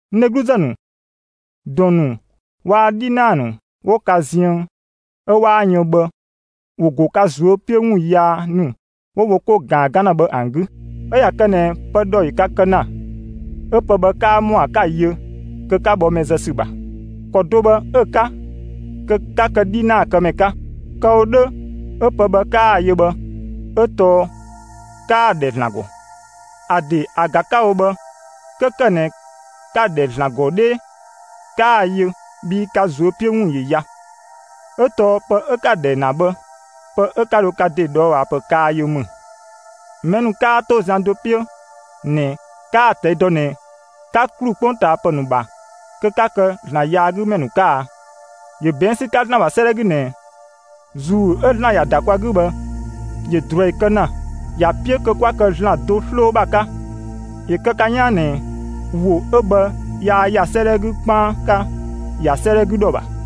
(N dhegluzë ‑nu,) ‑dɔn ‑nu waa‑ 'dhinaa ‑nu 'wo ka ziën 'ö 'waa yën bhë, ‑wo ‑go ka ꞊zuö' 'piö ‑wun yaa ‑nu 'wo wo 'ko ꞊gaan 'gan ‑na bhë ‑an 'gü. 'Ö ꞊ya kë ꞊nɛ pë ‑dhɔ ‑yö ka kë ‑na, 'ö pë bhë 'kaa ‑mɔa 'ka‑ yö, kö 'ka bhɔ mɛ zë ‑sü ‑bha. ‑Kɔ do bhë 'ö‑ 'ka, kö 'ka kë 'dhinaakëmɛ 'ka. Kë‑ wo 'dhö 'ö pë bhë 'kaa‑ yö bhë, 'ö tɔɔ 'kaa‑ ‑dhɛ ‑Zlan ‑gɔ. ‑A ‑de ‑a ‑ga 'ka‑ wo bhë, 'kö ‑kë ꞊nɛ ka‑ ‑dhɛ ‑Zlan ‑gɔ 'dhee, 'kaa‑ yö, bhii ka ꞊zuö' 'piö ‑wun ‑yö ya, 'ö tɔɔ pë 'ö 'ka‑ ‑dhɛ ‑na bhë, pë 'ö 'ka dho ka ‑de ꞊dhɔɔbhaapë kaa yö ‑mü. Mɛ ‑nu 'kaa ‑to zian do 'piö ꞊nɛ, 'kaa‑ ꞊tɛi' dɔ ꞊nɛ 'ka ‑klu 'kpongtaapë ‑nu ‑bha kö 'ka kë ‑Zlan yaagümɛ ‑nu 'ka a? ‑Yö ꞊bɛɛn' ‑sü 'ka ‑Zlan ‑bha 'sëëdhɛ 'gü ꞊nɛ: ‑Zuu 'ö ‑Zlan ‑ya ‑da kwa 'gü bhë, ‑yö ꞊druɛi kë ‑na; ‑ya 'piö kö 'kwa kë ‑Zlan do 'sloo ‑bha 'ka. ‑Yö kë ka 'yaan ꞊nɛ ‑wo 'ö bhë yaa ‑ya 'sëëdhɛ 'gü 'dhö 'kpaan 'ka, ‑ya 'sëëdhɛ 'gü ‑dhɔ ‑bha.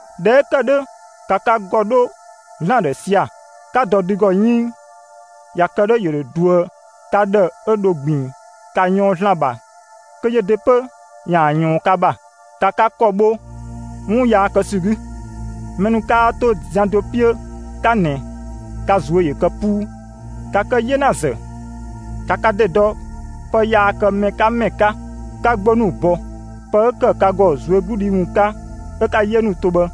꞊Dhɛ 'ö ‑kë 'dhö, ‑ka ka ‑gɔ 'dho ‑Zlan ‑dhë sia‑, 'ka dɔ dü ‑gɔ 'yënng; ꞊ya kë 'dhö, ‑yö ‑dho ꞊duë ka ‑dhë 'ö dho ꞊gbiin. ‑Ka ꞊yɔɔn ‑Zlan ‑bha kö yö ‑de 'pö ‑yaan ꞊yɔɔn ka ‑bha. ‑Ka ka ‑kɔ bho 'wun yaa kë ‑sü 'gü; mɛ ‑nu 'kaa 'to zian do 'piö 'ka ꞊nɛ, ka ꞊zuö' ‑yö kë 'puu. ‑Ka kë 'yenazë, ‑ka ka ‑de dɔ pë yaa kë mɛ 'ka ‑mɛ 'ka, 'ka 'gbo ‑nu bɔ. Pë 'ö ‑kë ka ‑gɔ ꞊zuögludhi ‑wun 'ka 'ö 'ka‑ 'yee ‑nu to bhë,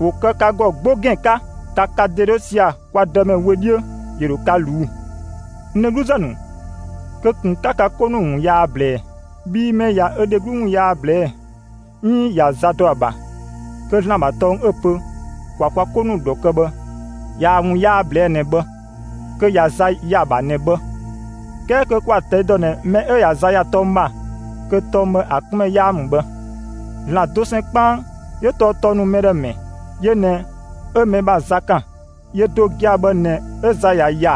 ‑wo kë ka ‑gɔ 'gbo ‑gɛn 'ka. ‑Ka ka ‑de 'dho sia‑ kwa Dëmɛ wö 'dhiö; ‑yö ‑dhö ka ꞊luu'‑. N dhegluzë ‑nu, kö ꞊kun 'ka ka 'ko ‑nu ‑wun yaa ꞊blɛɛ; bhii mɛ 'ö ꞊ya ö dheglu ‑wun yaa ꞊blɛɛ'‑, 'iin ꞊ya za dɔ ‑a ‑bha, kö ‑Zlan ‑bha tɔng ('ö‑ pö ‑kwa kwa 'ko ‑nu ‑dhɔ kë bhë) ꞊yaa‑ ‑wun yaa ꞊blɛɛ' ꞊nɛ bhë; kö ꞊ya za ‑ya ‑a ‑bha ꞊nɛ bhë. 'Kɛɛ kö kwa‑ ꞊tɛi' ‑dɔ ꞊nɛ mɛ 'ö ꞊ya za ‑ya tɔng ‑bha, kö tɔng bhë, ‑a 'kun ‑mɛ 'yaa ‑mü bhë. ‑Zlan dosɛn 'kpaan 'yö tɔɔ tɔng ‑nu mɛ ‑dhë ‑mɛ; yö ꞊nɛ 'ö mɛ ‑bha za ‑kan; yö do gia‑ bhë ꞊nɛ 'ö za ꞊ya ‑ya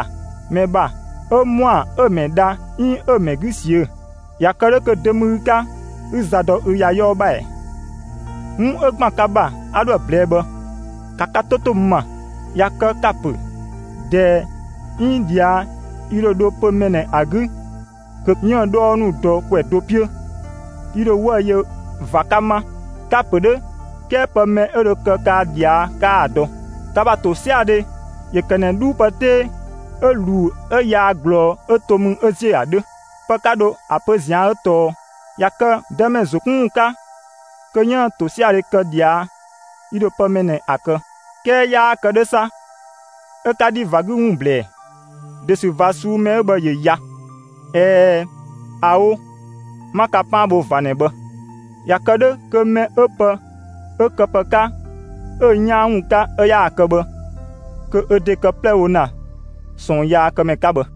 mɛ ‑bha, 'ö ‑mɔa 'ö mɛ dha 'iin 'ö mɛ 'gü ꞊siö'‑. ꞊Ya kë 'dhö kö dö ‑mü ü 'ka 'ü za dɔ ü ‑ya 'yɔɔ ‑bha ‑ɛ? 'Wun 'ö ‑gban ka ‑bha 'a 'dhoë‑ ꞊blɛɛ'‑ bhë; ‑ka ka 'to 'to n ‑ma. ꞊Ya kë ka‑ ‑pö: «꞊Dɛɛ 'iin ꞊dhia', yi ‑dho dho pö‑ mɛ ꞊nɛ ‑a 'gü kö 'yiën‑ 'dhɔɔ ‑nu dɔ ‑kwɛ do 'piö; yi ‑dho 'wëü‑ yö ꞊va 'ka 'ma.» Ka‑ ‑pö 'dhö, 'kɛɛ pë mɛ 'ö dho kë kaa ꞊dhia', 'kaa‑ dɔ! Ka ‑bha ‑tosiadhe ‑yö ‑kë ꞊nɛ 'dhuu pë 'tee 'ö ꞊luu 'ö yaa ꞊glɔɔ 'ö to mü 'ö ‑ziö ‑a 'dhö. Pë 'ka dho ‑a pö ꞊zian' 'ö tɔɔ: «꞊Ya kë Dëmɛ ‑zo 'kun ‑wun 'ka, kö 'yiën‑ ‑tosiadhe kë ꞊dhia', yi ‑dho pë mɛ ꞊nɛ ‑a kë.» 'Kɛɛ 'yaa kë 'dhö 'sa, 'ö 'ka 'dhi ꞊va 'gü ‑wun ꞊blɛɛ. ‑De ‑sü ꞊va ꞊suu'‑ mɛ 'ö bhë ‑yö ya. ꞊Ɛɛ, ꞊aoo! 'Ma ka 'paan bho ꞊va ꞊nɛ bhë. ꞊Ya kë 'dhö kö mɛ 'ö pë 'ö‑ këpë 'ka 'ö‑ 'yaan ‑wun 'ka 'ö 'yaa kë bhë, kö ö ‑de ‑kë 'plɛ 'ö‑ wo ‑na ꞊sɔɔnyaakëmɛ 'ka bhë.